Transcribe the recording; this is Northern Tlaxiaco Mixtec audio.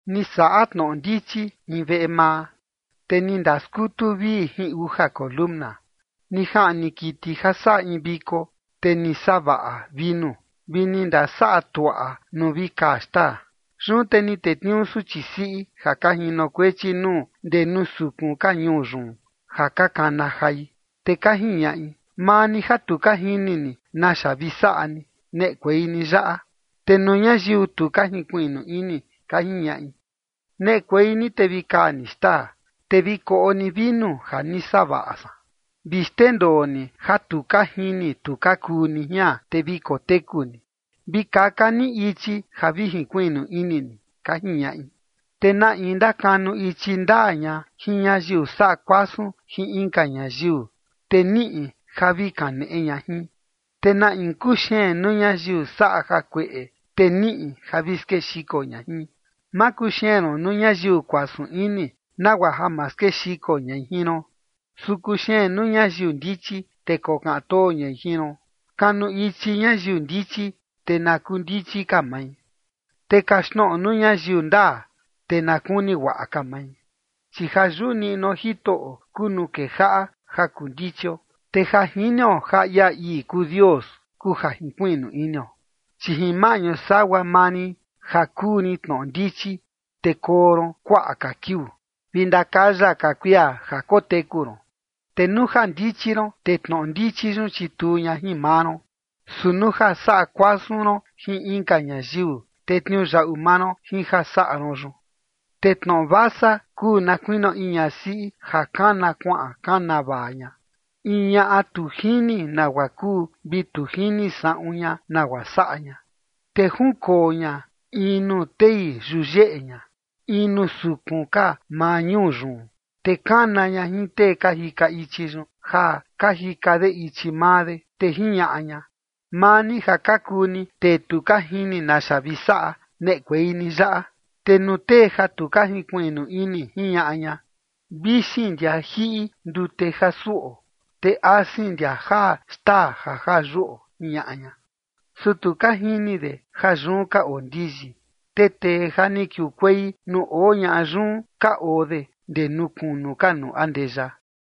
Ni saꞌa tnoꞌo ndichi in veꞌe maa, te ni ndaskutu vii uja siꞌin ndee. Ni jaꞌni kiti ja saꞌa in viko, te ni savaꞌa vinu, vi ni ndasaꞌa tuaꞌa nuu vi kaa xtaa. Yun te ni tetniuu suchi siꞌi ja ka jinokuechi nuu ndee nuu sukun ka ñuu yun ja ka kana jai. Te ka jiñaꞌi: “Maa ni ja tu ka jini ni naxa vi saꞌa ni, neꞌekuei ni yaꞌa”. Te nuu ñayiu tu ka jinkuiꞌnu ini, ka jiñaꞌi: “Neꞌekuei ni te vi kaa ni xtaa, te vi koꞌo ni vinu ja ni savaꞌa san. Vi xndendoo ni ja tu ka jini tu ka kuu ni jian, te vi koteku ni. Vi kaka ni ichi ja vi jinkuiꞌnu ini ni”, ka jiñaꞌi. Te na in ndakanu ichi ndaa ña jin ñayiu saꞌa kuasun jin inka ñayiu, te niꞌi ja vi kaneꞌe ña jin. Te na in kuxeen nuu ñayiu saꞌa jakueꞌe, te niꞌi ja vi skexiko ña jin. Ma kuxeen ron nuu ñayiu kuasun ini, nagua ja ma skexiko ñai jin ron, su kuxeen nuu ñayiu ndichi, te kokaꞌan too ñai jin ron. Kanu ichi ñayiu ndichi, te na kuu ndichi ka mai, te kaxtnoꞌo nuu ñayiu ndaa, te na kuni guaꞌa ka mai. Chi jayuꞌu niꞌnuo Jitoꞌo kuu nuu kejaꞌa ja kuu ndichio, te ja jinio ja ia ii kuu Dios, kuu ja jinkuiꞌnu inio. Chi jin maꞌñu sagua maa rin ja kuu rin tnoꞌo ndichi, te koo ron kuaꞌa ka kiuu, vi ndakaya ka kuia ja koteku ron. Te nuu ja ndichi ron, te tnoꞌo ndichi yun chituu ña jin maa ron, su nuu ja saꞌa kuasun ron jin inka ñayiu, te tniuyaꞌu maa ron jin ja saꞌa ron yun. Te tnoꞌo vasa kuu na kuinio in ñasiꞌi ja kana kuaꞌan kana vaa ña, in ñaꞌa tu jini nagua kuu, vi tu jini saꞌun ña nagua saꞌa ña. Te junkoo ña in nuu tei yuyeꞌe ña, in nuu sukun ka maa ñuu yun. Te kana ña jin tee ka jika ichi yun, ja ka jika de ichi maa de. Te jiñaꞌa ña: “Maa ni ja ka kuu ni tee tu ka jini naxa vi saꞌa, neꞌekuei ni yaꞌa”. Te nuu tee ja tu ka jinkuiꞌnu ini, jiñaꞌa ña: “Vixin ndia jiꞌi ndute ja suꞌo, te asin ndia jaa xtaa ja jaa yuꞌo”, jiñaꞌa ña. Su tu ka jini de ja yun ka oo ndiyi, te tee ja ni kiukuei nuu oo ñaꞌa yun ka oo de ndee nuu kunu ka nuu andeya.